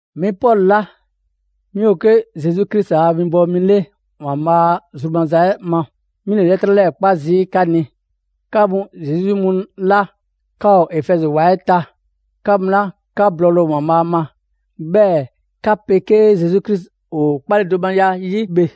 'Mi Pɔlu 'la 'mi ‑o 'ke Zesu Krisi a winbɔwo mi 'le ‑Waanbhaa' a zru maza ma, 'mi ‑le 'lɛtrɛ 'lɛɛ‑ 'kpa zii' 'ka ni, 'ka mu Zesu 'yi mu 'la 'ka ‑o [Efɛzi ‑wa] 'ɛ ta, 'ka mu 'la 'ka blɔɔle ‑o ‑Waanbhaa' ma, 'bhɛɛ‑ 'ka 'pegee Zesu Krisi ‑o 'kpaledomaya 'yi bhe.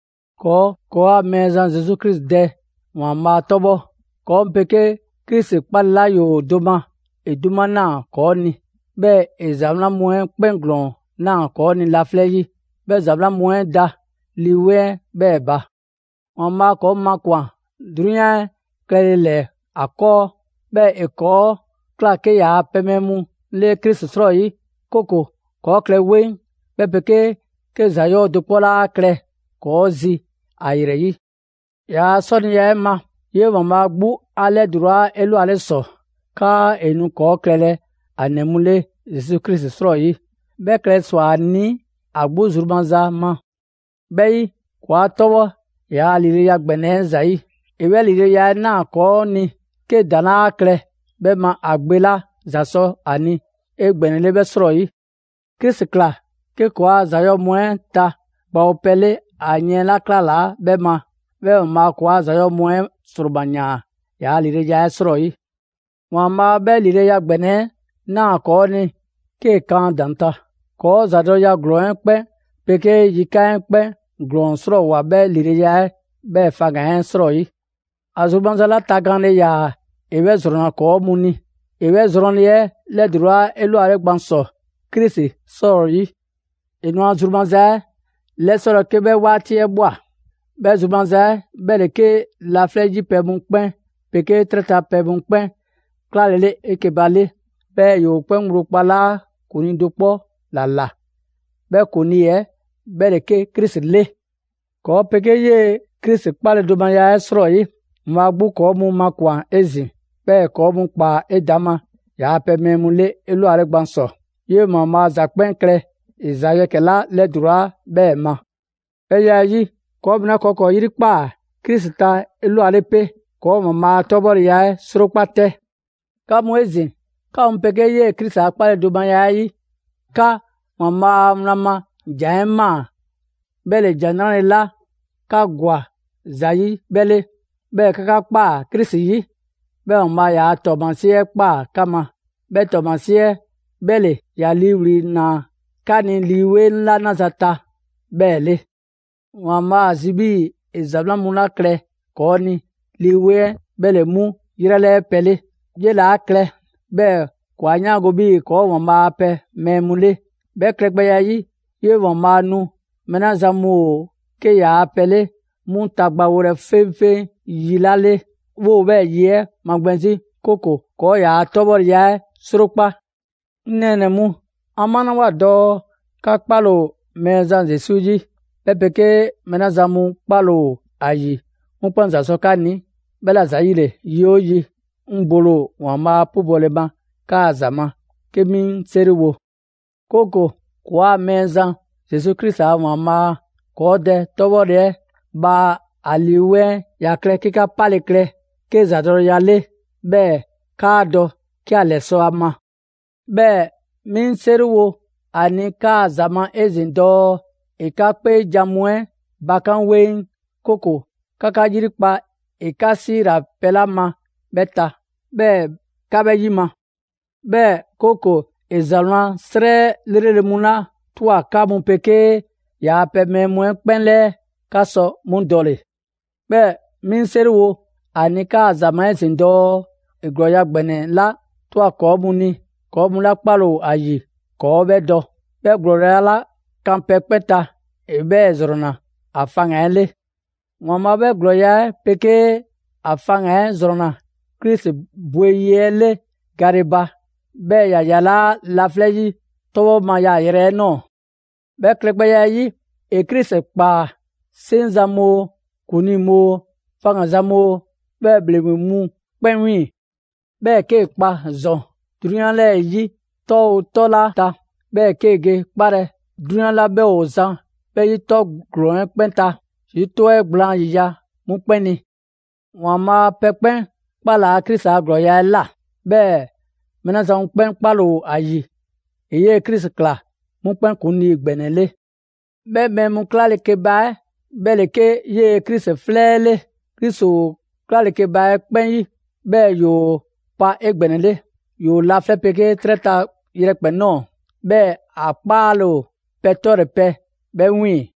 ‑Kɔɔ' ‑kɔɔa' Mɛɛzan Zesu Krisi Dɛ ‑Waanbhaa' 'tɔbhɔ! ‑Kɔɔ' mu 'pegee Krisi 'kpale‑ 'la ‑yoo do ma, ‑e 'duma ꞊naa ‑kɔɔ' ni, 'bhɛɛ‑ ‑e ‑za 'wlan mu 'ɛ 'kpɛn ‑glɔɔn ꞊naa ‑kɔɔ' ni laflɛ' 'yi. 'Bhɛ ‑za 'wlan mu 'ɛ da Lii 'Weŋ 'ɛ 'bhɛɛ‑ ba. ‑Waanbhaa' ‑kɔɔ' mu makwan‑ 'drunyan 'ɛ klɛle ‑lɛɛ ‑a ‑kɔɔ, 'bhɛɛ‑ ‑e ‑kɔɔ' ꞊kla 'ke ‑yaa' pɛ mɛɛ mu 'le Krisi 'srɔyi; 'kooko‑ ‑kɔɔ' klɛ 'weŋ, 'bhɛ 'pegee 'ke ‑za 'yɔɔ‑ do 'kpɔ 'laa klɛ ‑kɔɔ' zi ‑a ‑yrɛ 'yi. ‑Yaa' 'sɔniya 'ɛ ma, 'yee‑ ‑Waanbhaa' 'gbu 'a 'lɛdulaa 'elwale ‑sɔ 'kaa ‑e nu ‑kɔɔ' klɛlɛ ‑a ‑nɛ mu 'le Zesu Krisi 'srɔyi. 'Bhɛ klɛle ‑swa ‑a ni ‑a 'gbu zru maza ma. 'Bhɛ 'yi, ‑kɔɔ' 'a 'tɔbhɔ ‑yaa' ‑lileya ‑gbɛnɛ 'ɛ ‑zayi'. ‑E 'bhɛ ‑lileya 'ɛ ꞊naa ‑kɔɔ' ni 'ke ‑daŋ' 'laa klɛ 'bhɛ ma ‑a Gbe 'la ‑za sɔ ‑a ni 'egbɛnɛle 'bhɛ 'srɔyi. Krisi ꞊kla 'ke ‑kɔɔa' ‑za 'yɔɔ‑ mu 'ɛ ta gbawopɛ 'le ‑a yiɛn 'la 'klalaa 'bhɛ ma, 'bhɛɛ‑ ‑Waanbhaa' ‑kɔɔa' ‑za 'yɔɔ‑ mu 'ɛ ‑sroma ‑yaan ‑yaa' ‑lileya 'ɛ 'srɔyi. ‑Waanbhaa' 'bhɛ ‑lileya ‑gbɛnɛ 'ɛ ꞊naa ‑kɔɔ' ni 'kee‑ kan ‑a ‑daŋ' ta; ‑kɔɔ' ‑zadɔleya ‑glɔɔn 'ɛ 'kpɛn 'pegee yikan' 'ɛ 'kpɛn ‑glɔɔn 'srɔɔwoa‑ 'bhɛ ‑lileya 'ɛ 'bhɛɛ‑ faŋga‑ 'ɛ 'srɔyi. ‑A zru maza 'la tagaanle ‑yaa ‑e 'bhɛ ‑zrɔnna 'kɔɔ‑ mu ni; ‑e 'bhɛ zrɔnle 'ɛ 'lɛdulaa 'elwale gban ‑sɔ Krisi 'srɔyi. ‑E nu ‑a zru maza 'ɛ 'lɛsɔlɛ 'ke 'bhɛ 'waati 'ɛ ꞊bhwa. 'Bhɛ zru maza 'ɛ 'bhɛ ‑le 'ke laflɛ' 'yi pɛ mu 'kpɛn 'pegee 'trɛ ta pɛ mu 'kpɛn 'klalele 'eke‑ ba 'le, 'bhɛɛ‑ ‑yoo 'kpɛn ŋgblo kpalaa' ‑kuŋlii do 'kpɔ ‑la ꞊la; 'bhɛ ‑kuŋlii 'ɛ 'bhɛ ‑le 'ke Krisi 'le. ‑Kɔɔ' 'pegee 'yee‑ Krisi 'kpaledomaya 'ɛ 'srɔyi, ‑Waanbhaa' 'gbu ‑kɔɔ' mu makwan‑ 'ezin‑, 'bhɛɛ‑ ‑e ‑kɔɔ' ꞊kpaa 'edaŋma ‑yaa' pɛ mɛɛ mu 'le 'elwale gban ‑sɔ. 'Yee‑ ‑Waanbhaa' ‑za 'kpɛn klɛ ‑e ‑za ‑yɛkɛ 'la 'lɛdulaa 'bhɛɛ‑ ma. 'Bhɛ ya 'ɛ 'yi, ‑kɔɔ' mu 'la ‑kɔɔ' ‑kɔɔ' 'yrikpaa‑ Krisi ta 'elwale 'pe, ‑kɔɔ' ‑Waanbhaa' a 'tɔbhɔleya 'ɛ 'srokpa 'tɛ! 'Ka mu 'ezin‑, 'ka mu 'pegee 'yee‑ Krisi a 'kpaledomaya 'ɛ 'yi, 'ka ‑Waanbhaa' a wlan ma ‑Jan 'ɛ ꞊maa. 'Bhɛ ‑le ‑Jan 'Nrale‑ 'la 'ka ‑gwa ‑za ‑yi 'bhɛ 'le, 'bhɛɛ‑ 'ka 'ka ꞊kpaa Krisi 'yi. 'Bhɛɛ‑ ‑Waanbhaa' ‑yaa' ‑tɔɔmasie 'ɛ ꞊kpaa 'ka ma, 'bhɛ ‑tɔɔmasie 'ɛ 'bhɛ ‑le ‑ya ‑liiwli' ‑naa 'ka ni Lii 'Weŋ 'la 'naza‑ ta 'bhɛɛ‑ 'le. ‑Waanbhaa' ‑a zi 'bhii‑ ‑e ‑za 'wlan 'la klɛ ‑kɔɔ' ni, Lii 'Weŋ 'ɛ 'bhɛ ‑le 'mu 'yrɛ 'lɛɛ pɛ 'le. 'Yele‑ 'a klɛ 'bhɛɛ‑ ‑kɔɔ' 'a 'yaango‑ 'bhii‑ ‑kɔɔ' ‑o ‑Waanbhaa' a pɛ mɛɛ mu 'le. 'Bhɛ klɛgbɛya 'ɛ 'yi, 'yee‑ ‑Waanbhaa' nu mɛɛ 'la zan mu ‑o 'ke ‑yaa' pɛ 'le 'mu tagbawolɛ 'feŋfeŋ yi 'la 'le, 'woo‑ 'bhɛɛ‑ yi 'ɛ magbɛn 'zi, 'kooko‑ ‑kɔɔ' ‑yaa' 'tɔbhɔleya 'ɛ 'srokpa‑. 'Ŋ nɛɛnɛ‑ mu, 'an 'malawoa dɔɔ 'ka 'kpale‑ ‑o Mɛɛzan Zesu 'yi, 'bhɛ 'pegee mɛɛ 'la zan mu 'kpale‑ ‑o ‑a ‑yi 'mu 'kpɛn ‑za sɔ 'ka ni, 'bhɛla‑ ‑zayile, yi 'oo yi, 'ŋ bole ‑o ‑Waanbhaa' 'pubɔle ma 'kaa‑ ‑za ma, 'ke 'mi 'ŋ 'seriwo; 'kooko‑ ‑kɔɔa' Mɛɛzan Zesu Krisi a ‑Waanbhaa', ‑kɔɔ' Dɛ 'tɔbhɔle 'ɛ, bhaa a Lii 'Weŋ 'ɛ ‑ya klɛ 'ke 'ka 'pale‑ klɛ 'ke ‑zadɔleya 'le, 'bhɛɛ‑ 'kaa dɔ 'ke ‑a ‑lɛsɔ' a ma. 'Bhɛɛ‑ 'mi 'ŋ 'seriwo ‑a ni 'kaa ‑za ma 'ezin‑ dɔɔ ‑e 'ka 'kpeejan‑ mu 'ɛ bakan' 'weŋ, 'kooko‑ 'ka 'ka 'yrikpa ‑e 'ka 'siila‑ pɛ 'la ma 'bhɛ ta, 'bhɛɛ‑ 'ka 'bhɛ 'yima‑. 'Bhɛɛ‑ 'kooko‑ ‑e ‑za 'wlan 'srɛ 'lrele‑ mu 'la ꞊twa 'ka mu 'pegee ‑yaa' pɛ mɛɛ mu 'ɛ 'kpɛn 'lɛɛ‑, 'ka sɔ 'mu dɔle‑. 'Bhɛɛ‑ 'mi 'ŋ 'seriwo ‑a ni 'kaa ‑za ma 'ezin‑ dɔɔ ‑e ‑glɔɔya' ‑gbɛnɛ 'la ꞊twa ‑kɔɔ' mu ni, ‑kɔɔ' mu 'la 'kpale‑ ‑o ‑a ‑yi, ‑kɔɔ' 'bhɛ dɔ. 'Bhɛ ‑glɔɔya' 'la kan pɛ 'kpɛn ta ‑e 'bhɛɛ‑ ‑zrɔnna ‑a faŋgan‑ 'ɛ 'le. ‑Waanbhaa' 'bhɛ ‑glɔɔya' 'ɛ 'pegee ‑a faŋgan‑ 'ɛ ‑zrɔnna Krisi bwe yi 'ɛ 'le gale ba, 'bhɛɛ‑ ‑ya ‑yalaa' laflɛ' 'yi 'tɔbhɔ ma yaayrɛ 'ɛ ꞊nɔɔ. 'Bhɛ klɛgbɛya 'ɛ 'yi, ‑e Krisi ‑kpaa 'seŋzan‑ mu oo, ‑kuŋlii mu oo, faŋganzan mu oo, 'bhɛɛ‑ ‑bhleŋgbe mu 'kpɛn 'wiiŋ‑. 'Bhɛɛ‑ 'kee‑ kpa ‑zɔn 'drunyan 'lɛɛ‑ 'yi 'tɔ 'oo 'tɔ 'la ta, 'bhɛɛ‑ 'kee‑ ge 'kpalɛ‑ 'drunyan 'la 'bhɛ ‑o zan 'bhɛ 'yi 'tɔ ‑glɔɔn 'ɛ 'kpɛn ta, Zesu 'tɔ 'ɛ gblaan ‑yiya' 'mu 'kpɛn ni. ‑Waanbhaa' pɛ 'kpɛn 'kpalaa Krisi a ‑glɔɔya' 'ɛ ꞊la, 'bhɛɛ‑ mɛɛ 'la zan mu 'kpɛn 'kpale‑ ‑o ‑a ‑yi, ‑e 'yee‑ Krisi ꞊kla 'mu 'kpɛn ‑Kuŋlii ‑gbɛnɛ 'le. 'Bhɛ mɛɛ mu 'klale‑ keba 'ɛ 'bhɛ ‑le 'ke 'yee‑ Krisi 'flɛ 'ɛ 'le. Krisi ‑o 'klale‑ keba 'ɛ 'kpɛn 'yi, 'bhɛɛ‑ ‑yoo pa 'egbɛnɛle. ‑Yoo laflɛ' 'pegee 'trɛ ta yrɛkpɛn‑ ꞊nɔɔ, 'bhɛɛ‑ ‑a 'kpaale‑ ‑o pɛ 'tɔle‑ pɛ 'bhɛ 'wiiŋ‑.